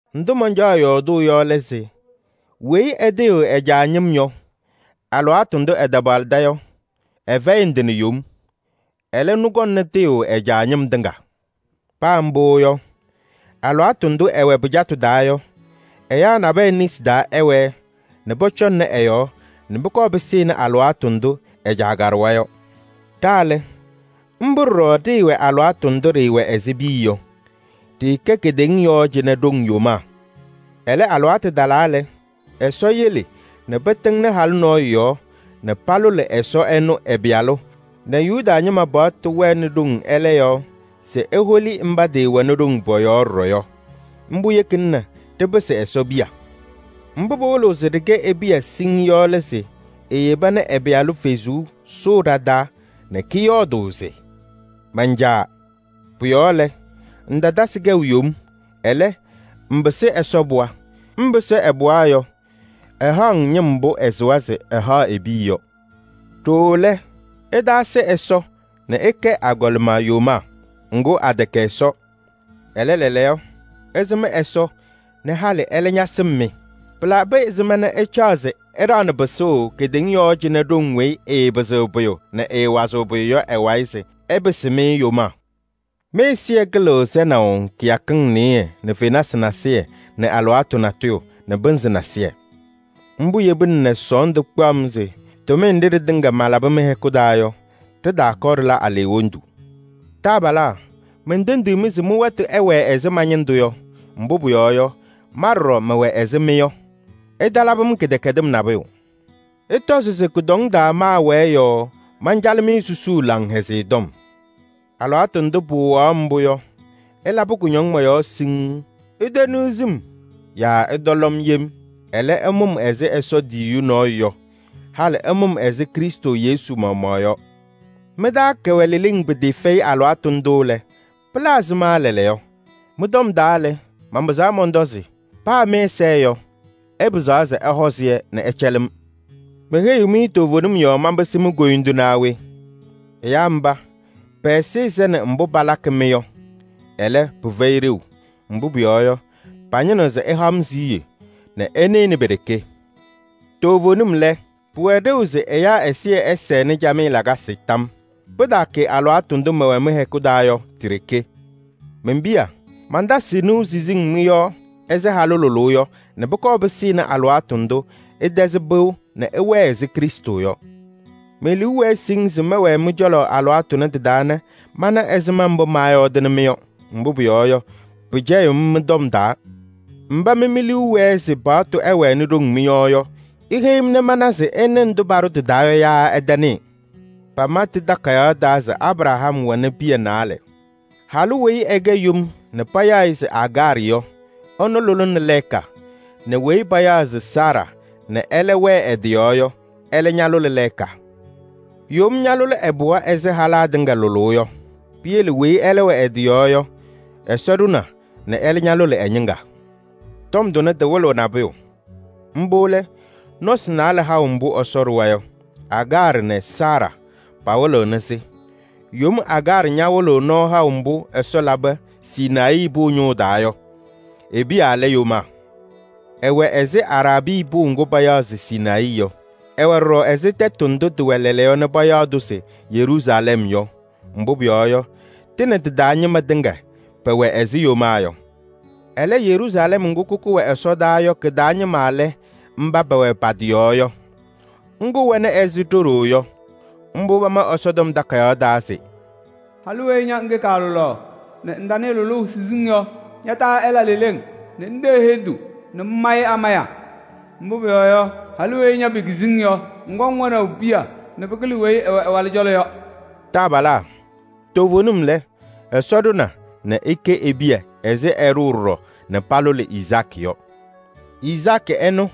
Ndʋ mancaɣ yɔɔdʋʋ yɔ lɛ se: weyi ɛtɩɣyɩɣ ɛ-caa ñɩm yɔ, alɩwaatʋ ndʋ ɛtapaɣlɩda yɔ, ɛfɛyɩ ndɩ nɛ yom. Ɛlɛ, ɛnʋ kɔŋna tɩɣyʋʋ ɛ-caa ñɩm tɩŋa. Paa mbʋ yɔ, alɩwaatʋ ndʋ ɛwɛ pɩcatʋ taa yɔ, ɛyaa nabɛyɛ nesi taa ɛwɛɛ nɛ pɔcɔŋnɩ ɛ-yɔɔ nɛ pʋkɔɔ pɩsɩnɩ alɩwaatʋ ndʋ ɛ-caa kaɖʋwa yɔ. Ɖa lɛ, mbʋ ɖɔɖɔ ɖɩɩwɛ alɩwaatʋ ndʋ ɖɩɩwɛ ɛzɩ piya yɔ. Ɖɩɩkɛ kedeŋa yɔɔ cɩnɛ ɖoŋ yomaa. Ɛlɛ, alɩwaatʋ talaa lɛ, Ɛsɔ yele nɛ pɩtɩŋnɩ halʋ nɔɔyʋ yɔɔ nɛ palʋlɩ Ɛsɔ ɛnʋ ɛ-Pɩyalʋ nɛ Yuda ñɩma paɣtʋ wɛnɩ ɖoŋ ɛlɛ yɔɔ se eholi mba tɩɩwɛnɩ ɖoŋ pɔ-yɔɔ ɖɔɖɔ yɔ. Mbʋ yekina nɛ ɖɩpɩsɩ Ɛsɔ piya. Mbʋ pɩwɩlɩɣ se ɖɩkɛ e-piya siŋŋ yɔ lɛ se eyeba nɛ ɛ-Pɩyalʋ Kalɩzaɣ sʋʋ ɖa-taa nɛ kɔyɔɔdʋʋ se: “Man-Caa!” Pʋ-yɔɔ lɛ, ŋtatasɩ kɛʋ yom, ɛlɛ, ŋpɩsɩ Ɛsɔ pɩɣa. Ŋpɩsɩ ɛ-pɩɣa yɔ, ɛhaɣ-ŋ ñɩm mbʋ ɛsɩwa se ɛhaɣ e-piya yɔ. Ɖooo lɛ, ɩtaasɩ Ɛsɔ nɛ ɩkɛ agɔlɩma yomaa. Ŋgʋ, atɛkɛ Ɛsɔ. Ɛlɛ, lɛɛlɛɛyɔ, ɩsɩm Ɛsɔ nɛ halɩ ɛlɛ ñasɩm-mɩ. Pɩlabɩ ɛzɩma nɛ ɩcaɣ se ɩɖaɣnɩ pɩsʋʋ kedeŋa yɔɔ cɩnɛ ɖoŋ weyi ɩɩpɩzɩɣ pʋyʋ nɛ ɩɩwazɩɣ pʋyʋ yɔ ɩ-wayɩ se ɩpɩsɩ-mɩ yomaa? Mɩ-ɛzɩyɛ kɩlɩɣ sɛnaʋ kɩyakɩŋ nɩyɩɩ nɛ fenasɩ nasɩyɩ nɛ alɩwaatʋ natʋyʋ nɛ pɩnzɩ nasɩyɩ! Mbʋ yebina nɛ sɔɔndʋ kpaɣ-m se tʋmɩyɛ nɖɩ ɖɩtɩŋa malabɩ mɩ-hɛkʋ taa yɔ, ɖɩtaakɔɔ ɖɩla aleɣwondu. Taabalaa! Mentendiɣ-mɩ se mɩ-wɛtʋ ɛwɛɛ ɛzɩ ma-ñɩndʋ yɔ, mbʋ pʋyɔɔ yɔ, ma ɖɔɖɔ mɛwɛ ɛzɩ mɩ yɔ. Ɩtalabɩ-m kɩdɛkɛdɩm nabʋyʋ. Ɩtɔzɩ se kʋdɔŋ taa maawɛɛ yɔɔ mancalɩ-mɩ susuu Laŋhɛzɩyɛ Tɔm. Alɩwaatʋ ndʋ pɩwɩɣaɣ-m mbʋ yɔ, ɩlabɩ kʋñɔŋ mɔ-yɔɔ siŋŋ, iteniɣzi-m yaa ɩtɔlɔ-m yem. Ɛlɛ, ɩmʋ-m ɛzɩ Ɛsɔ tiyiyu nɔɔyʋ yɔ, halɩ ɩmʋ-m ɛzɩ Krɩstʋ Yesu maɣmaɣ yɔ. Mɩ-taa kɛwɛ leleŋ pɩtɩɩfɛyɩ alɩwaatʋ ndʋ lɛ, pɩla ɛzɩma lɛɛlɛɛyɔ? Mɩ-tɔm taa lɛ, manpɩzaɣ mɔntɔ se: paa mɩ-ɛza yɔ, ɩpɩzaɣ se ɩhɔɔzɩ-yɛ nɛ ɩcɛlɩ-m. Meheyiɣ-mɩ toovenim yɔɔ manpɩsɩ mi-koyindu naa we? Ɛyaa mba, pɛ-ɛzɩyɛ sɛnɩ mbʋ palakɩ-mɩ yɔ, ɛlɛ, pɩfɛyɩ ɖeu. Mbʋ pʋyɔɔ yɔ, pañɩnɩɣ se ɩha-m siɣye nɛ ɩnɩnɩ pe-ɖeke. Toovenim lɛ, pɩwɛ ɖeu se ɛyaa ɛzɩyɛ ɛsɛnɩ camɩyɛ lakasɩ tam yɔɔ. Pɩtaakɛ alɩwaatʋ ndʋ mɛwɛ mɩ-hɛkʋ taa yɔ, ti-ɖeke. Men-piya! Mantasɩɣ nɩʋ siziŋ mɩ-yɔɔ ɛzɩ halʋ lʋlʋʋ yɔ nɛ pʋkɔɔ pɩsɩnɩ alɩwaatʋ ndʋ ɩtɛzɩ pɩʋ nɛ ɩwɛɛ ɛzɩ Krɩstʋ yɔ. Me-liu wɛɛ siŋŋ se mɛwɛɛ mɩ-cɔlɔ alɩwaatʋ tʋnɛ tɩ-taa nɛ mana ɛzɩma mbʋ maayɔɔdɩnɩ-mɩ yɔ. Mbʋ pʋyɔɔ yɔ, pɩcɛyɩɣ-m mɩ-tɔm taa! Mba mɩ mi-liu wɛɛ se paɣtʋ ɛwɛnɩ ɖoŋ mɩ-yɔɔ yɔ, iheyi-m nɛ mana se ɩnɩ ndʋ paɖʋ tɩ-taa yɔ yaa ɩtanɩɩ? Pama tɩ-takayaɣ taa se Abraham wɛnɩ piya naalɛ: halʋ weyi ɛkɛ yom nɛ payaɣ-ɩ se Agaarɩ yɔ, ɛlʋlɩnɩ lɛɛka nɛ weyi payaɣ se Saara nɛ ɛlɛ wɛ ɛ-tɩ yɔɔ yɔ, ɛlɛ ñalʋlɩ lɛɛka. Yom ñaalʋlɩ ɛ-pɩɣa ɛzɩ halaa tɩŋa lʋlʋʋ yɔ. Piyele weyi ɛwɛ ɛ-tɩ yɔɔ yɔ, Ɛsɔ ɖʋna nɛ ɛlɛ ñalʋlɩ ɛ-ñɩŋga. Tɔm tʋnɛ tɩwɩlɩɣ nabʋyʋ, mbʋ lɛ: nɔsɩ naalɛ haʋ mbʋ Ɛsɔ ɖʋwa yɔ. Agaarɩ nɛ Saara pawɩlɩɣnɩ-sɩ. Yom Agaarɩ ñawɩlɩɣ nɔɔ haʋ mbʋ Ɛsɔ labɩ Sinayii pʋʋ ñʋʋ taa yɔ, e-piya lɛ yomaa. Ɛwɛ ɛzɩ Araabii pʋʋ ŋgʋ payaɣ se Sinayii yɔ. Ɛwɛ ɖɔɖɔ ɛzɩ tɛtʋ ndʋ tɩwɛ lɛɛlɛɛyɔ nɛ payaɣ-tʋ se Yeruusalɛm yɔ. Mbʋ pʋyɔɔ yɔ, tɩ nɛ tɩ-taa ñɩma tɩŋa pɛwɛ ɛzɩ yomaa yɔ. Ɛlɛ, Yeruusalɛm ŋgʋ kʋkʋ wɛ ɛsɔdaa yɔ kɩ-taa ñɩma lɛ mba pɛwɛ pa-tɩ yɔɔ yɔ, ŋgʋ wɛna ɛzɩ ɖo-ɖoo yɔ. Mbʋ pama Ɛsɔtɔm Takayaɣ taa se: “Halʋ weyi ña ŋkɛ kaalʋlaɣ nɛ ŋtanɩɩ lʋlʋʋ siziŋ yɔ, ña-taa ɛla leleŋ nɛ ŋtee hendu nɛ ŋmayɩ amaya! Mbʋ pʋyɔɔ yɔ, halʋ weyi ña pekizi-ŋ yɔ, ŋkɔŋ wɛnaʋ piya nɛ pɩkɩlɩ weyi ɛwɛ ɛ-walʋ cɔlɔ yɔ.” Taabalaa! Toovenim lɛ, Ɛsɔ ɖʋna nɛ ɩkɛ e-piya ɛzɩ ɛɖʋʋ ɖɔɖɔ nɛ palʋlɩ Izaakɩ yɔ. Izaakɩ ɛnʋ,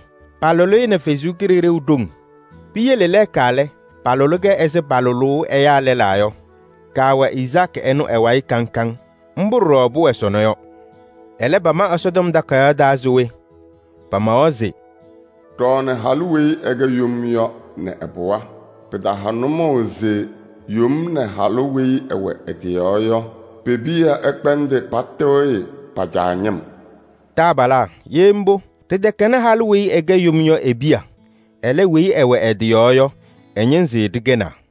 paalʋlɩ-ɩ nɛ Ɛsɔ Kalɩzaɣ ɖoŋ. Piyele lɛɛka lɛ, palʋlɩ-kɛ ɛzɩ palʋlʋʋ ɛyaa lɛlaa yɔ. Kaawɛ Izaakɩ ɛnʋ ɛ-wayɩ kaŋ kaŋ. Mbʋ ɖɔɖɔ pʋwɛ sɔnɔ yɔ. Ɛlɛ, pama Ɛsɔtɔm Takayaɣ taa se we? Pamawa se: “Ɖɔɔnɩ halʋ weyi ɛkɛ yom yɔ nɛ ɛ-pɩɣa. Pɩtaha nʋmɔʋ se yom nɛ halʋ weyi ɛwɛ ɛ-tɩ yɔɔ yɔ pe-piya ɛkpɛndɩ patɩɣyɩ pa-caa ñɩm.” Taabalaa! Ye mbʋ, ɖɩtɛkɛnɩ halʋ weyi ɛkɛ yom yɔ e-piya, ɛlɛ, weyi ɛwɛ ɛ-tɩ yɔɔ yɔ, ɛ-ñɩnzɩ ɖɩkɛnaa.